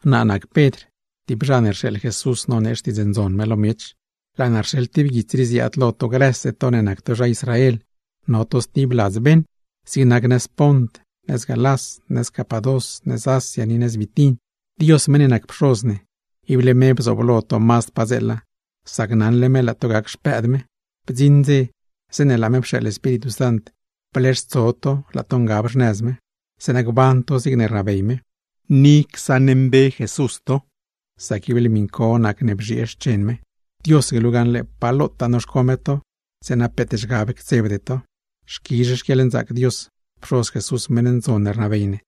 Naa nac Pedr, tib zha ne rxeeḻ Jesús nonee Xtiidz Ndzon me lo miech. Laa naa rxeḻ tib guits rii ziaad lo to grëse to ne nac to zha Israel, no to stib ladz beṉ: zig nac nëz Pont, nëz Galás, nëz Capadós, nëz Asia ni nëz Bitin. Dios meṉ ne nac Pxoz ne, ible me bzooblo to mazd padzeela, sac naṉle me laa to gac xpëëd me. Bdziṉ dze, zeeṉe laa me pxeeḻ Espíritu Sant bleextso to laa to ngab xnëz me, zeeṉa gban to zigne rnabey me, ni lozh csaṉmbe Jesús to; sac ible miṉ co nacne bzhiee xchen me. Dios glu gaṉle pa lotaa noxco me to, zeeṉa peet zhgab ctsebde to. Xquizh xquieḻnzaac Dios, Pxoz Jesús meṉ ndzon ne rnabey ne,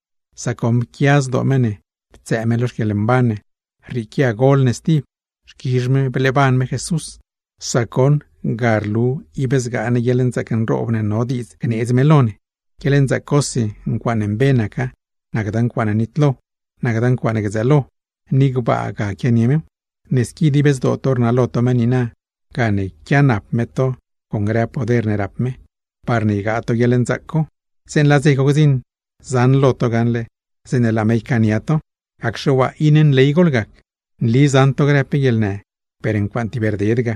sac goṉ pquia zdoo me ne ptsëë me lo xquieḻmban ne, rrieequia gol ne stib. Xquizh me bleeban me Jesús, sac goṉ ga rlu ib zgaa ne guieḻnzaac nroob ne no diidz gneedz me lo ne, guieḻnzaac cosi ncuaaṉe mbe naca, nacda ncuaaṉe nitlo, nacda ncuaaṉe gdzëëlo, ni gbaa ga quianie mew. Ne squi dib zdoo to rnalo to me niina, gane quianap me to con grëtaa poder ne rap me, parne ygaa to guieḻnzaac co. Zeeṉe laa dze co gdziṉ, zaṉlo to gaṉle zeeṉe laa me ycaania to. Gacxe waa iṉe nley goḻgac. Nli zaṉ to grë pe guieḻnë, per ncuaaṉe tib rded ga.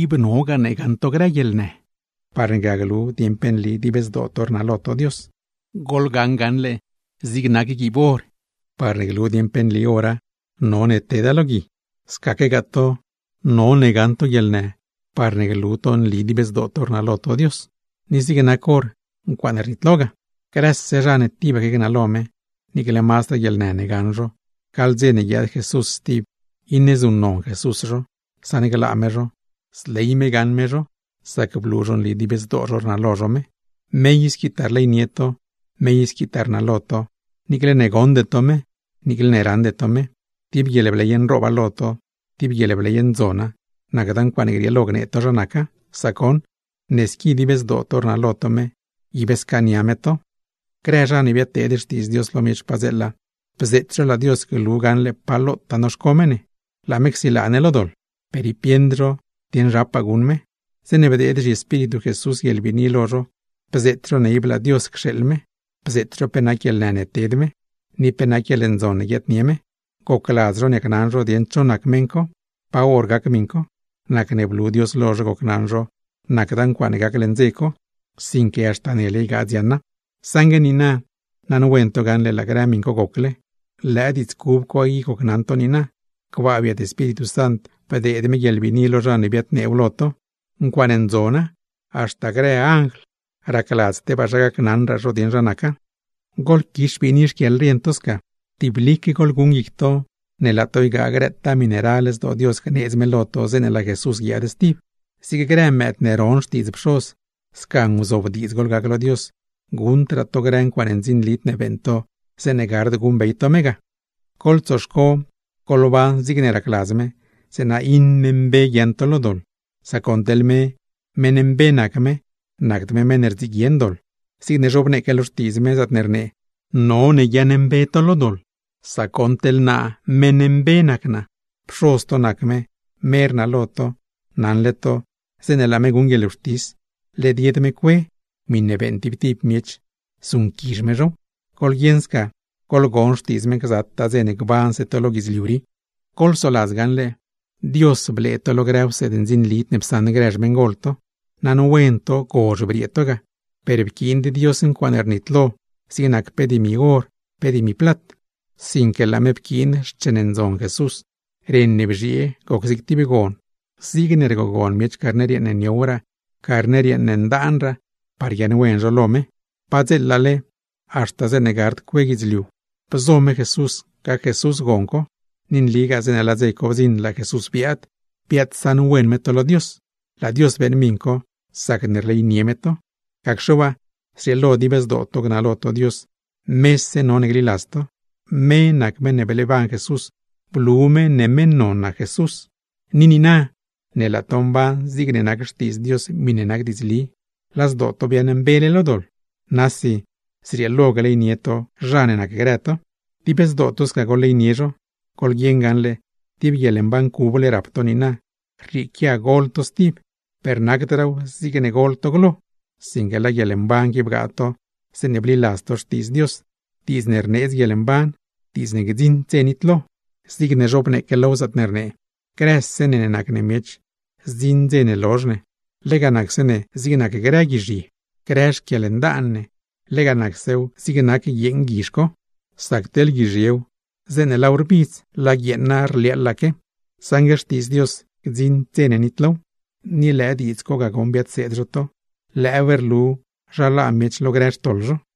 Ib none gaṉ to grë guieḻnë, parne ga glu dieṉ pe nli dib zdoo to rnalo to Dios. Zig nac guiib or, parne glu dieṉ pe nli ora, none teda lo gui; scaquegaa to, none gaṉ to guieḻnë parne glu to nli dib zdoo to rnalo to Dios; ni zig nac or, ncuaaṉe rnitlo ga. Grëse zha ne tibaque gnalo me, niicle mazdraa guieḻnë ne gaṉ zho, gaḻ dze ne guiaad Jesús stib, iṉe zuṉnon Jesús zho, saṉglaa me zho, zley me gaṉ me zho, sac blu zho nli dib zdoo zho rnalo zho me. Me i squitaa rleynie to, me i squitaa rnalo to, niicle ne goṉde to me, niicle ne raṉde to me. Tib guieḻbley nrooba lo to, tib guieḻbley ndzona, nacda ncuaaṉe grieelo gnee to zha naca; sac goṉ, ne squi dib zdoo to rnalo to me, ib scaania me to. Grë zha ne biadteed Xtiidz Dios lo miech padzeela, bzeet zho laa Dios glu gaṉle pa lotaa noxco me ne, laa me csilaa ne lo doḻ; per ib bieṉd zho dieṉ zhapaa guṉ me. Zeeṉe bdeed zhiEspíritu Jesús guieḻbiini lo zho bzeet zho ne ib laa Dios cxeeḻ me, pe nac guieḻnë ne ted me, ni pe nac guieḻndzon ne guiaadnie me; gocladz zho niacnaṉ zho dieṉ cho nac meṉ co, pa hor gac miṉ co. Nacne blu Dios lo zho gocnaṉ zho nacda ncuaaṉe gac leṉ dze co, sinque haxta nele ygaa dziaṉa. Saṉgue niina, naṉwen to gaṉle laa grë miṉ co gocle, lëë diidz cub co i gocnaṉ to niina, gbaa biet Espíritu Sant bdeed me guieḻbiini lo zha ne biadneew lo to. ¡Ncuaaṉe ndzona, haxta grë anjl racladz tebaa zha gacnaṉraa zho dieṉ zha naca! Goḻquix biini xquieḻrien to sca. Tiblique goḻguṉ guic to ne laa to ygaa grëtaa miṉe ral zdoo Dios gneedz me lo to, zeeṉe laa Jesús guiaad stib. Zig grë mëëd ne ron xtiidz pxoz, sca nguzobdiidz goḻgac lo Dios; guṉdraa to grë ncuaaṉ ndzinlid ne beeṉ to zeeṉe gard guṉbey to me ga. Goḻtsoxco goḻban zigne racladz me, zeeṉa iṉe mbe guiaaṉ to lo doḻ; sac goṉ teḻ me, meṉ mbe nac me, nacd me meṉ ne rdziguien doḻ. Zigne zhobneeque lo Xtiidz me, zaatne rnee: “None guiaaṉmbe to lo doḻ, sac goṉ meṉ mbe nac naa.” Pxoz to nac me, me rnalo to, naṉle to zeeṉe laa me guṉ guieḻwxtis, led yed me cue; miṉe beeṉ tib tib miech, zuṉquizh me zhow. Goḻguieṉ sca, goḻgon xtiidz me gzataa dze ne gbanse to lo guidzliu rii. Goḻsoladz me blee to lo grë wseed ndzinlid ne psaṉ grë xmeṉgol to; naṉwen to gozh briee to ga; per pquiind me ncuaaṉe rnitlo zig nac pe dimi or, pe dimi plat; sinque laa me pquiin xchen ndzon Jesús. Ren ne bzhiee goc zig tib gon, zigne rgogon miech carner yeeṉ ne mazdraa niow, carner yeeṉ ne mazdraa ndaan parne guiaaṉwen zho lo Dios. Padzeelale, haxta zeeṉe gard cue guidzliu bzo Dios me gac me gon co, ni nligaa zeeṉe laa dze co bdziṉ laa me biaad, biaadsaṉwen me to lo Dios; laa Dios beeṉ miṉ co sacne rleynie me to. Gacxe waa, zrieelo dib zdoo to gnalo to Dios, mese none gliladz to. Me nac meṉ ne bleeban Jesús, blu me ne meṉ non nac Jesús. Ni niina ne laa to mban zigne nac XTiidz Dios, miṉe nac diidzli, laa zdoo to biaaṉmbele lo doḻ; nasi zrieelo gleynie to zha ne nacgrë to. Dib zdoo to sca goḻleynie zho, goḻguieṉ gaṉle, tib guieḻmban cuble rap to niina, rrieequia gol to stib; per nacdraaw zigne gol to glo, sinque lëë guieḻmban qui bgaa to zeeṉe bliladz to Xtiidz Dios, diidz ne rneedz guieḻmban, diidz ne gdziṉd dze nitlo. Zigne zhobneeque low, zaatne rnee: Grëse ne nac ne miech, zdziṉ dze ne lozh ne, lega nacse ne zig nac grë guizhye, grë xquieḻndaan ne, lega nacsew zig nac guieeṉ guizh co. Sac teḻ guizhyew, zeeṉe laaw rbidz, laa guieeṉa rliaaḻaque; saṉgue Xtiidz Dios, gdziṉd dze ne nitlow. Ni lëë diidz co ga goṉ biadseed zho to, lëëw rlu zha laa miech lo grë xtoḻ zho.